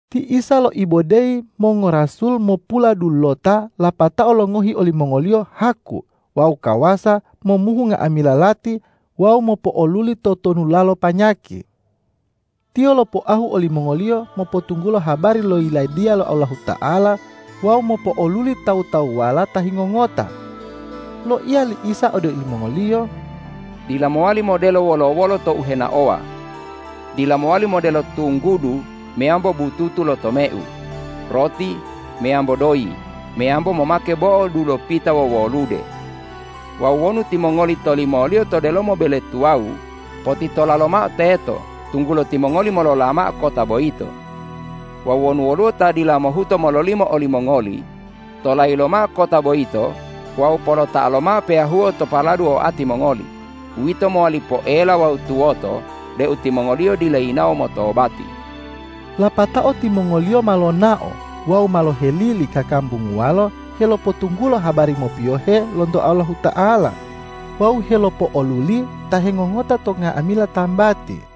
Ti Isa loibodeyi mongorasul mopuladulota lapatao longohi olimongoliyo haku wawu kawasa momuhu nga'amila lati wawu mopo'oluli totonulalo panyaki. Tiyo lopoahu olimongoliyo mopotunggulo habari lo Yiladiya lo Allahuta'ala wawu mopo'oluli tawu-tawuwala ta hingongota. Loiya li Isa ode olimongoliyo,”Dila mowali modelo wolo-wolo tou henaowa. Dila mowali modelo tunggudu meyambo bututu lo tomeu, roti, meyambo doyi, meyambo momake bo'o dulopita wowolude. Wawu wonu timongoli tolimoliyo to delomo bele tuwawu, potitola lomao teto, tunggulo timongoli molola mao kota boyito. Wawu wonu woluwo ta dila mohuto mololimo olimongoli, tolayi lomao kota boyito wawu polota'a lomao peyahuo to paladu oati mongoli, uwito mowali poela wawu tuwoto deu timongoliyo dila yinawo motobati.” Lapatao timongoliyo ma lonao wawu ma lohelili kakambunguwalo helopotunggulo habari mopiyohe lonto Allahuta'ala wawu helopo'oluli ta hengongota to nga'amila tambati.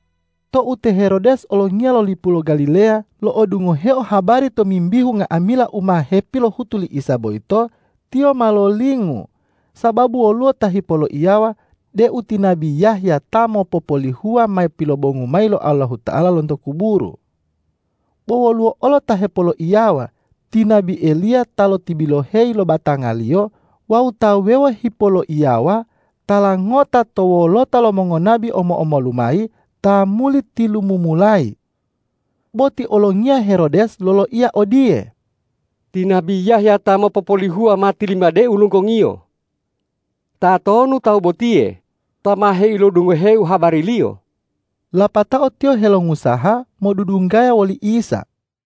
Tou te Herodes olongiya lo lipu lo Galileya, lo'odungoheo habari tomimbihu nga'amila u ma hepilohutu li Isa boyito, tiyo ma lolingu, sababu woluwo ta hepoloiyawa deu ti nabi Yahya ta mopopolihuwa ma pilopobongu mayi lo Allahuta'ala lonto kuburu. Bo woluwo olo ta hepoloiyawa, ti nabi Eliya ta lotibiloheyi lo batangaliyo wawu ta wuwewo hipoloiyawa, tala ngota to wolota lo mongonabi omo-omolu mayi ta muli tilumumulayi. Bo ti olongiya Herodes loloiya odiye,”Ti nabi Yahya ta mopopolihuwa ma tilimadeu lunggongiyo. Tatonu Tawu botiye ta ma heilodungoheu habari-Liyo?” Lapatao tiyo helongusaha modudunggaya woli Isa.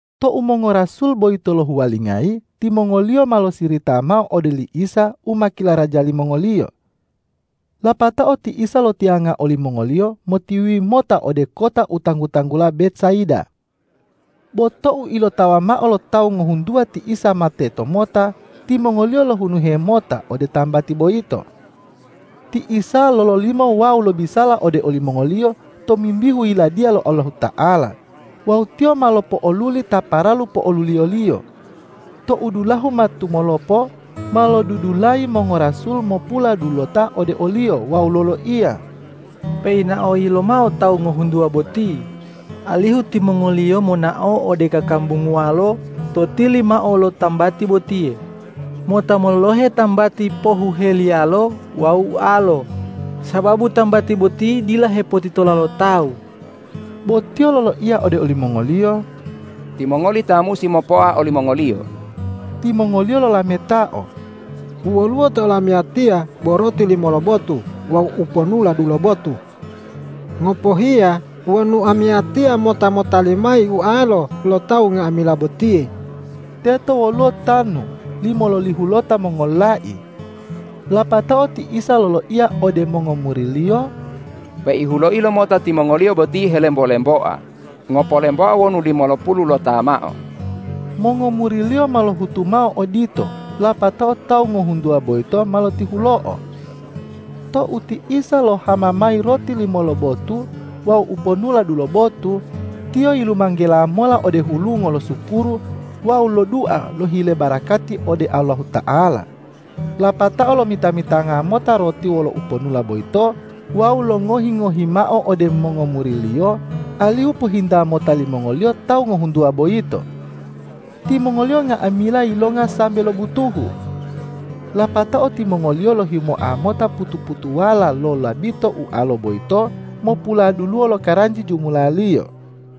Tou mongorasul boyito lohuwalingayi, timongoliyo ma losirita mao ode li Isa u ma kilaraja limongoliyo. Lapatao ti Isa lotiyanga olimongoliyo motiwiwi mota ode kota u tanggu-tanggula Betsaida. Bo tou ilotawa mao lo tawu ngohuntuwa ti Isa ma tetomota, timongoliyo lohunuhe mota ode tambati boyito. Ti Isa lololimo wawu lobisala ode olimongoliyo tomimbihu Yiladiya lo Allahuta'ala wawu Tiyo ma lopo'oluli ta paralu po'oluliyo-Liyo. Tou dulahu ma tumolopo, ma lodudulayi mongorasul mopuladulota ode o-Liyo wawu loloiya,”Peinaoyi lomao tawu ngohuntuwa boti, alihu timongoliyo monao ode kakambunguwalo to tili mao lo tambati botiye, mota mololohe tambati pohuheliyalo wawu ualo, sababu tambati boti dila hepotitola lo tawu.” Bo Tiyo loloiya ode olimongoliyo,”Timongoli ta musi mopoa olimongoliyo.” Timongoliyo lolametao,”U woluwo to olamiyatiya bo roti limo lobotu wawu uponula dulobotu. Ngopohiya wonu amiyatiya mota motali mayi ualo lo tawu nga'amila botiye.” Teto woluwo tanu limololihulota mongololai. Lapatao ti Isa loloiya ode mongomuri-Liyo,”Peihuloi lomota timongoliyo boti helembo-lemboa, ngopolemboa wonu limolopululota mao.” Mongomuri-Liyo ma lohutu mao odito, lapatao tawu ngohuntuwa boyito ma lotihulo'o. Tou ti Isa lohama mayi roti limo lobotu wawu uponula dulobotu, Tiyo yilumanggela mola ode hulungo losukuru wawu lodua lohile barakati ode Allahuta'ala, lapatao lomita-mitanga mota roti wolo uponula boyito wawu longohi-ngohi mao ode mongomuri-Liyo, alihu pohinta mota limongoliyo tawu ngohuntuwa boyito. Timongoliyo nga'amila yilonga sambe lobutuhu. Lapatao timongoliyo lohimoa mota putu-putuwala lo labito ualo boyito mopuladuluwo lokaranji jumulaliyo.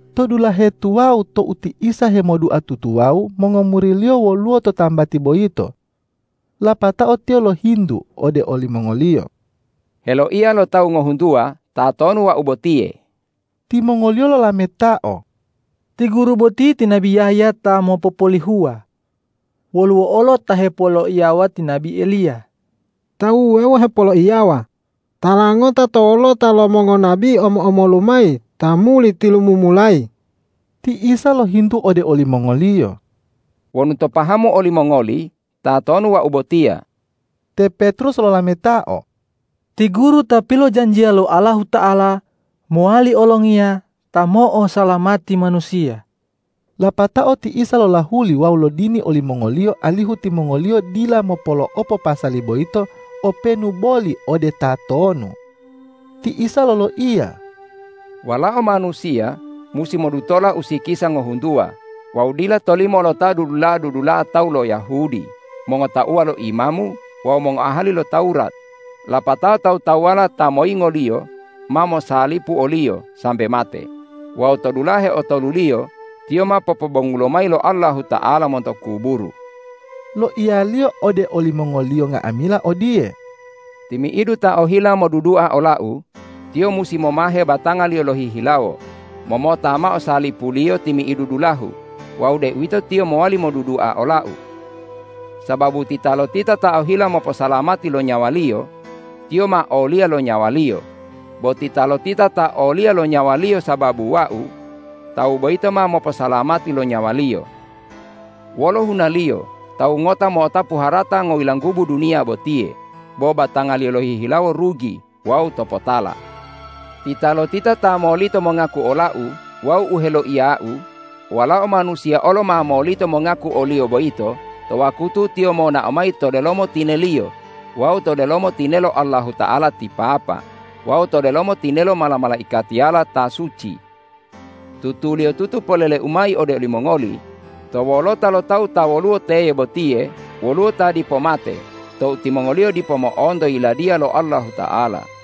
To dulahe tuwawu tou ti Isa hemodua tutuwawu, mongomuri-Liyo woluwo to tambati boyito. Lapatao tiyo lohintu ode olimongoliyo,”Heloiya lo tawu ngohuntuwa, tatonu Wau botiye?” Timongoliyo lolametao,”Ti Guru boti ti nabi Yahya ta mopopolihuwa. Woluwo olo ta hepoloiyawa, ti nabi Eliya; tawu wuwewo hepoloiyawa, tala ngota to wolota lo mongonabi omo-omolu mayi ta muli tilumumulayi.” Ti Isa lohintu ode olimongoliyo,”Wonu to pahamu olimongoli, tatonu Wau botiya?” Te Petrus lolametao,”Ti Guru ta pilojanjiya lo Allahuta'ala mowali olongiya ta mo'osalamati manusiya.” Lapatao ti Isa lolahuli wawu lodini olimongoliyo alihu timongoliyo dila mopolo'opo pasali boyito openu boli ode tatonu. Ti Isa loloiya,”Walao Manusiya musi modutola usikisa ngohuntuwa wawu dila tolimo lo ta dudula'a-dudula'a tawu lo Yahudi, mongotauwa lo imamu wawu mongoahali lo Tawurat, lapatao tawu-tawuwala ta moyingo-Liyo ma mosalipu o-Liyo sambe mate wawu to dulahe otoluliyo Tiyo ma popobongulo mayi lo Allahuta'ala monto kuburu.” Loiya-Liyo ode olimongoliyo nga'amila odiye,”Timi'idu ta ohila modudua ola-U, tiyo musi momahe batangaliyo lohihilawo, momota mao salipuliyo timi'idu dulahu wawu deuwito tiyo mowali modudua ola-U. Sababu titalotita ta ohila moposalamati lo nyawaliyo, tiyo ma oliya lo nyawaliyo; bo titalotita ta oliya lo nyawaliyo sababu Wau, tawu boyito ma moposalamati lo nyawaliyo. Wolo hunaliyo tawu ngota mo'otapu harata ngoyilanggubu duniya botiye bo batangaliyo lohihilawo rugi wawu topotala? Titalotita ta molito mongaku ola-U wawu u heloiya-U, Walao Manusiya olo ma molito mongaku oliyo boyito to wakutu Tiyo monao mayi to delomo tine-Liyo wawu to delomo tinelo Allahuta'ala ti Papa wawu to delomo tinelo mala-malaikatiyala ta suci. Tutuliyotutu polele-U mayi ode olimongoli: To wolota lo tawu ta woluwo teye botiye woluwo ta dipo mate tou timongoliyo dipo mo'onto Yiladiya lo Allahuta'ala.”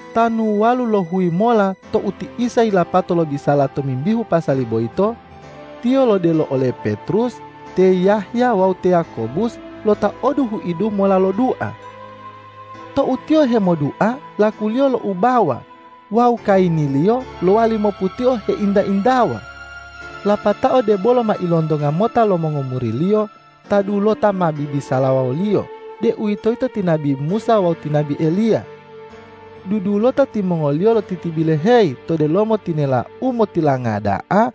Tanu walulohuyi mola tou ti Isa yilapato lobisala tomimbihu pasali boyito, Tiyo lodelo ole Petrus, te Yahya wawu te Yakobus, lotaodu huidu mola lodua. Tou tiyo hemodua, lakuliyo loubawa wawu kayiniliyo lowali moputio heinta-intawa. Lapatao debolo ma ilontonga mota lo mongomuri-Liyo, ta dulota ma bibisalawa woliyo, deuwitoyito ti nabi Musa wawu ti nabi Eliya. Dudulota timongoliyo lotitibiloheyi to delomo tinela u motilanga da'a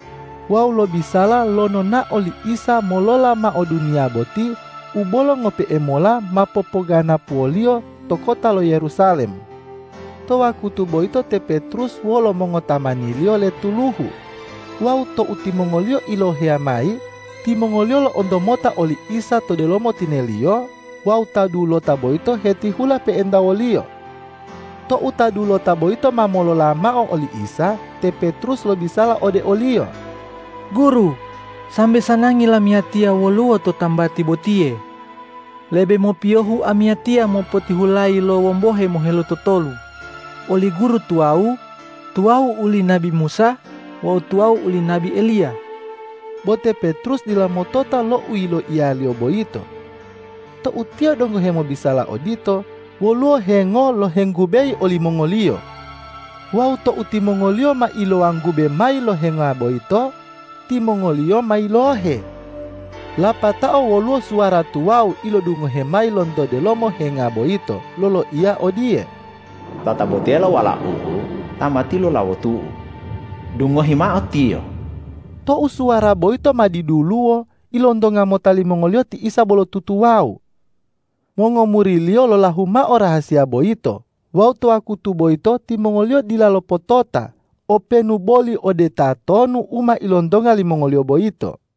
wawu lobisala lo nonao li Isa molola mao duniya boti u bolo ngope'e mola ma popoganapuwoliyo to kota lo Yerusalem. To wakutu boyito te Petrus wolo mongotamaniliyo letuluhu. Wawu tou timongoliyo iloheya mayi, timongoliyo lo'onto mota oli Isa to delomo tine-Liyo wawu ta dulota boyito hetihula pe'enta wo-Liyo. Tou ta dulota boyito ma molola mao oli Isa, te Petrus lobisala ode o-Liyo,”Guru, sambe sanangi lamiyatiya woluwo to tambati botiye. Lebe mopiyohu amiyatiya mopotihulayi lo wombohe mohelutotolu, uli Guru tuwawu, tuwawu oli nabi Musa wawu tuwawu uli nabi Eliya.” Bo te Petrus dila motota lo u yiloiyaliyo boyito. Tou tiyo donggo hemobisala odito, woluwo hengo lohenggubeyi olimongoliyo. Wawu tou timongoliyo ma ilowanggube mayi lo henga boyito, timongoliyo ma yilohe. Lapatao woluwo suwara tuwawu ilodungohe mayi lonto delomo henga boyito, loloiya odiye,”Tatabotiyelo Walau-U ta ma tilulawotu-U, dungohi mao Tiyo!” Tou suwara boyito ma diduluwo, ilontonga mota limongoliyo ti Isa bolo tutuwawu. Mongomuri-Liyo lolahu mao rahasiya boyito wawu to wakutu boyito timongoliyo dila lopotota openu boli ode tatonu u ma ilontonga limongoliyo boyito.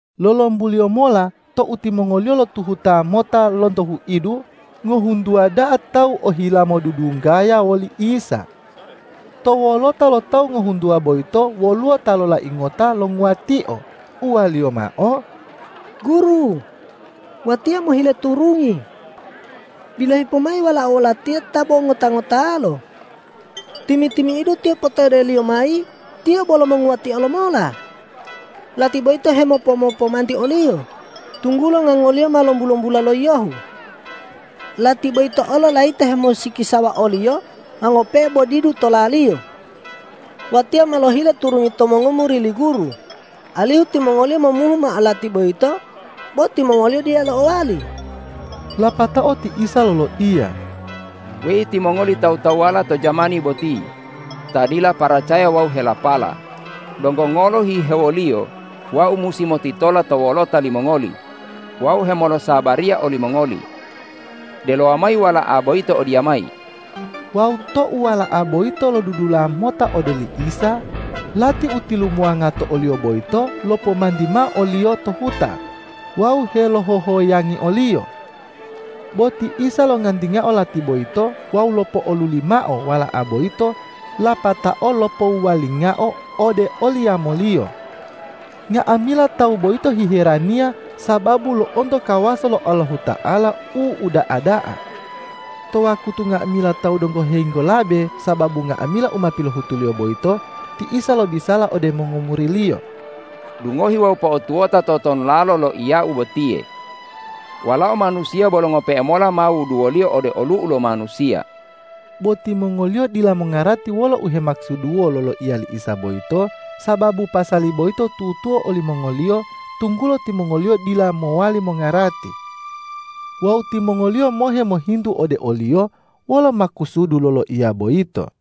Lolombuliyo mola tou timongoliyo lotuhuta mota lonto huidu, ngohuntuwa da'a tawu ohila modudunggaya woli Isa. To wolota lo tawu ngohuntuwa boyito woluwo ta lolai ngota longuwatio, uwaliyo mao,”Guru, watiya mohile turungi. Bilohi pomayi walao latiya ta bo ngota-ngotalo! Timi-timi'idu tiyo potodeliyo mayi, tiyo bolo monguwatio lomola. Lati boyito hemopo-mopomanti oliyo, tunggulo ngangoliyo ma lombu-lombula lo yiyohu. Lati boyito olo layito hemolosikisawa oliyo ma ngope'e bo didu tolaliyo. Watiya ma lohile turungi to mongomuri li Guru, alihu timongoliyo momuhu mao lati boyito, bo timongoliyo dila lo'owali.” Lapatao ti Isa loloiya,”Weyi timongoli tawu-tawuwala to jamani boti ta dila paracaya wawu helapala, donggo ngolo hihewoliyo Wau musi motitola to wolota limongoli wawu hemolosabariya olimongoli? Delowa mayi wala'a boyito odiyamayi!” Wawu tou wala'a boyito lodudula mota ode oli Isa, lati u tilumuwanga to oliyo boyito lopomanti mao oliyo to huta wawu helohohoyangi oliyo. Bo ti Isa longantingao lati boyito wawu lopo'oluli mao wala'a boyito lapatao lopowuwalingao ode oli yamoliyo. (a) Nga'amila tawu boyito hiheraniya sababu lo'onto kawasa lo Allahuta'ala u uda'a da'a. (b) To wakutu nga'amila tawu donggo helinggolabe sababu nga'amila u ma pilohutu-Liyo boyito, ti Isa lobisala ode mongomuri-Liyo. ”Dungohi wawu po'otuwota totonulalo loiya-U botiye: Walao Manusiya bolo ngope'e mola ma wuduwoliyo ode olu'u lo manusiya.” Bo timongoliyo dila mongarati wolo u hemakusuduwo loloiya li Isa boyito, sababu pasali boyito tutuo olimongoliyo, tunggulo timongoliyo dila mowali mongarati. Wawu timongoliyo mohe mohintu ode o-Liyo wolo makusudu loloiya boyito.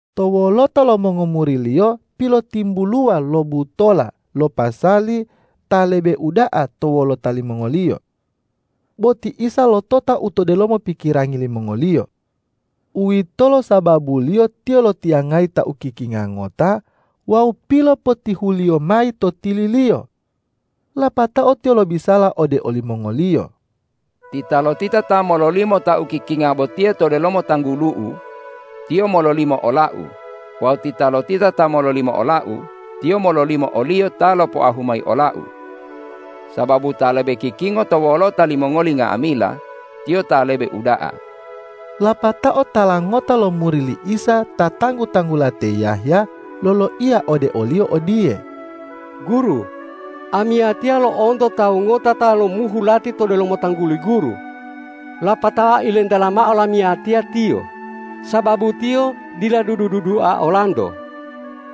To wolota lo mongomuri-Liyo pilotimbuluwa lo butola lo pasali ta lebe uda'a to wolota limongoliyo. Bo ti Isa lotota u to delomo pikirangi limongoliyo. Uwitolo sababuliyo Tiyo lotiyangayi ta ukikinga ngota wawu pilopotihuliyo mayi to tili-Liyo. Lapatao Tiyo lobisala ode olimongoliyo,”Titalotita ta mololimo ta ukikinga botiye to delomo tanggulu-U, tiyo mololimo ola-U; wawu titalotita ta mololimo ola-U, tiyo mololimo o-Liyo ta lopoahu mayi ola-U. Sababu ta lebe kikingo to wolota limongoli nga'amila, tiyo ta lebe uda'a!” Lapatao tala ngota lo muri li Isa ta tanggu-tanggula te Yahya loloiya ode o-Liyo odiye,”Guru, amiyatiya lo'onto tawu ngota ta lomuhu lati to delomo tangguli Guru, lapatao ilentela mao lamiyatiya tiyo, sababu tiyo dila dudu-dudua olanto.”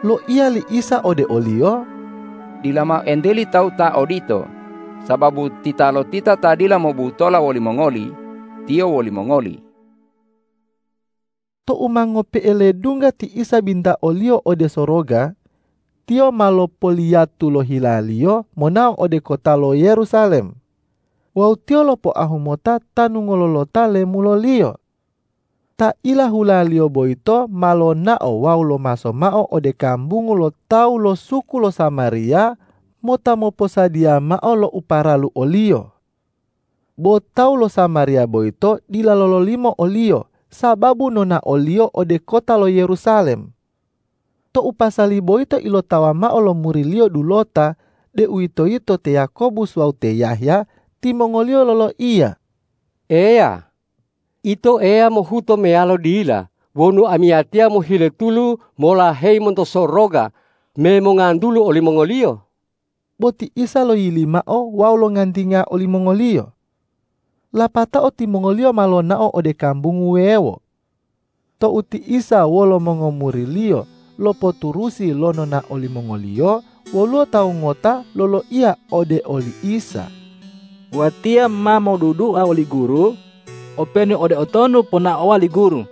Loiya li Isa ode oliyo,”Dila mao enteli tawu ta odito, sababu titalotita ta dila mobutola wolimongoli, tiyo wolimongoli.” Tou ma ngope'e ledungga ti Isa bintaoliyo ode soroga, Tiyo ma lopoliyatu lo hila-Liyo monao ode kota lo Yerusalem wawu Tiyo lopoahu mota tanu ngololota lemulo-Liyo. Ta ilahula-Liyo boyito ma lonao wawu lomaso mao ode kambungu lo tawu lo suku lo Samariya mota moposadiya mao lo u paralu o-Liyo. Bo tawu lo Samariya boyito dila lololimo o-Liyo sababu nonao-Liyo ode kota lo Yerusalem. Tou pasali boyito ilotawa mao lo muri-Liyo dulota, deuwitoyito te Yakobus wawu te Yahya, timongoliyo loloiya,”Eya, Ito Eya mohuto meyalo dila wonu amiyatiya mohile tulu molaheyi monto soroga me mongantulu olimongoliyo?” Bo ti Isa loyili mao wawu longantinga olimongoliyo. Lapatao timongoliyo ma lonao ode kambungu wuwewo. Tou ti Isa wolo mongomuri-Liyo lopoturusi lo nonao limongoliyo, woluwo tawu ngota loloiya ode oli Isa,”Watiya ma modudua oli Guru, openu ode utonu ponaowa li Guru!”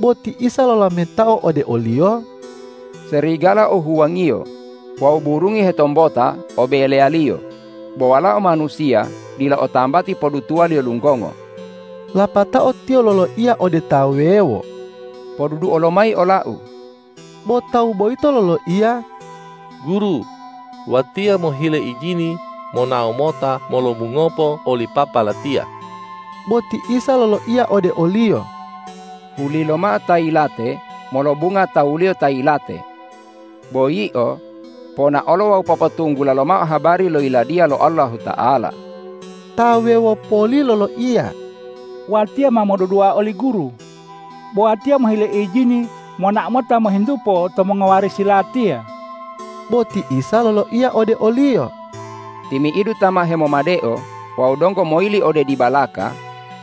Bo ti Isa lolametao ode oliyo,”Serigala o huwangiyo wawu burungi hetombota o beleyaliyo, bo Walao Manusiya dila o tambati podutuwaliyo lunggongo.” Lapatao Tiyo loloiya ode ta wuwewo,”Poduduo lomayi ola-U!” Bo tawu boyito loloiya,”Guru, watiya mohile ijini monao mota molobungopo oli papa latiya.” Bo ti Isa loloiya ode oliyo.”Hulilomao ta yilate molobunga tawuliyo ta yilate. Bo yio, ponaolo wawu popotunggula lomao habari lo Yiladiya lo Allahuta'ala.” Ta wuwewo poli loloiya,”Watiya ma modudua oli Guru, bo watiya mohile ijini monao mota mohintupo to mongowarisi latiya.” Bo ti Isa loloiya ode oliyo,”Timi'idu ta ma hemomadeo wawu donggo moyili ode dibalaka,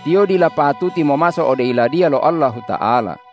tiyo dila patuti momaso ode Yiladiya lo Allahuta'ala.”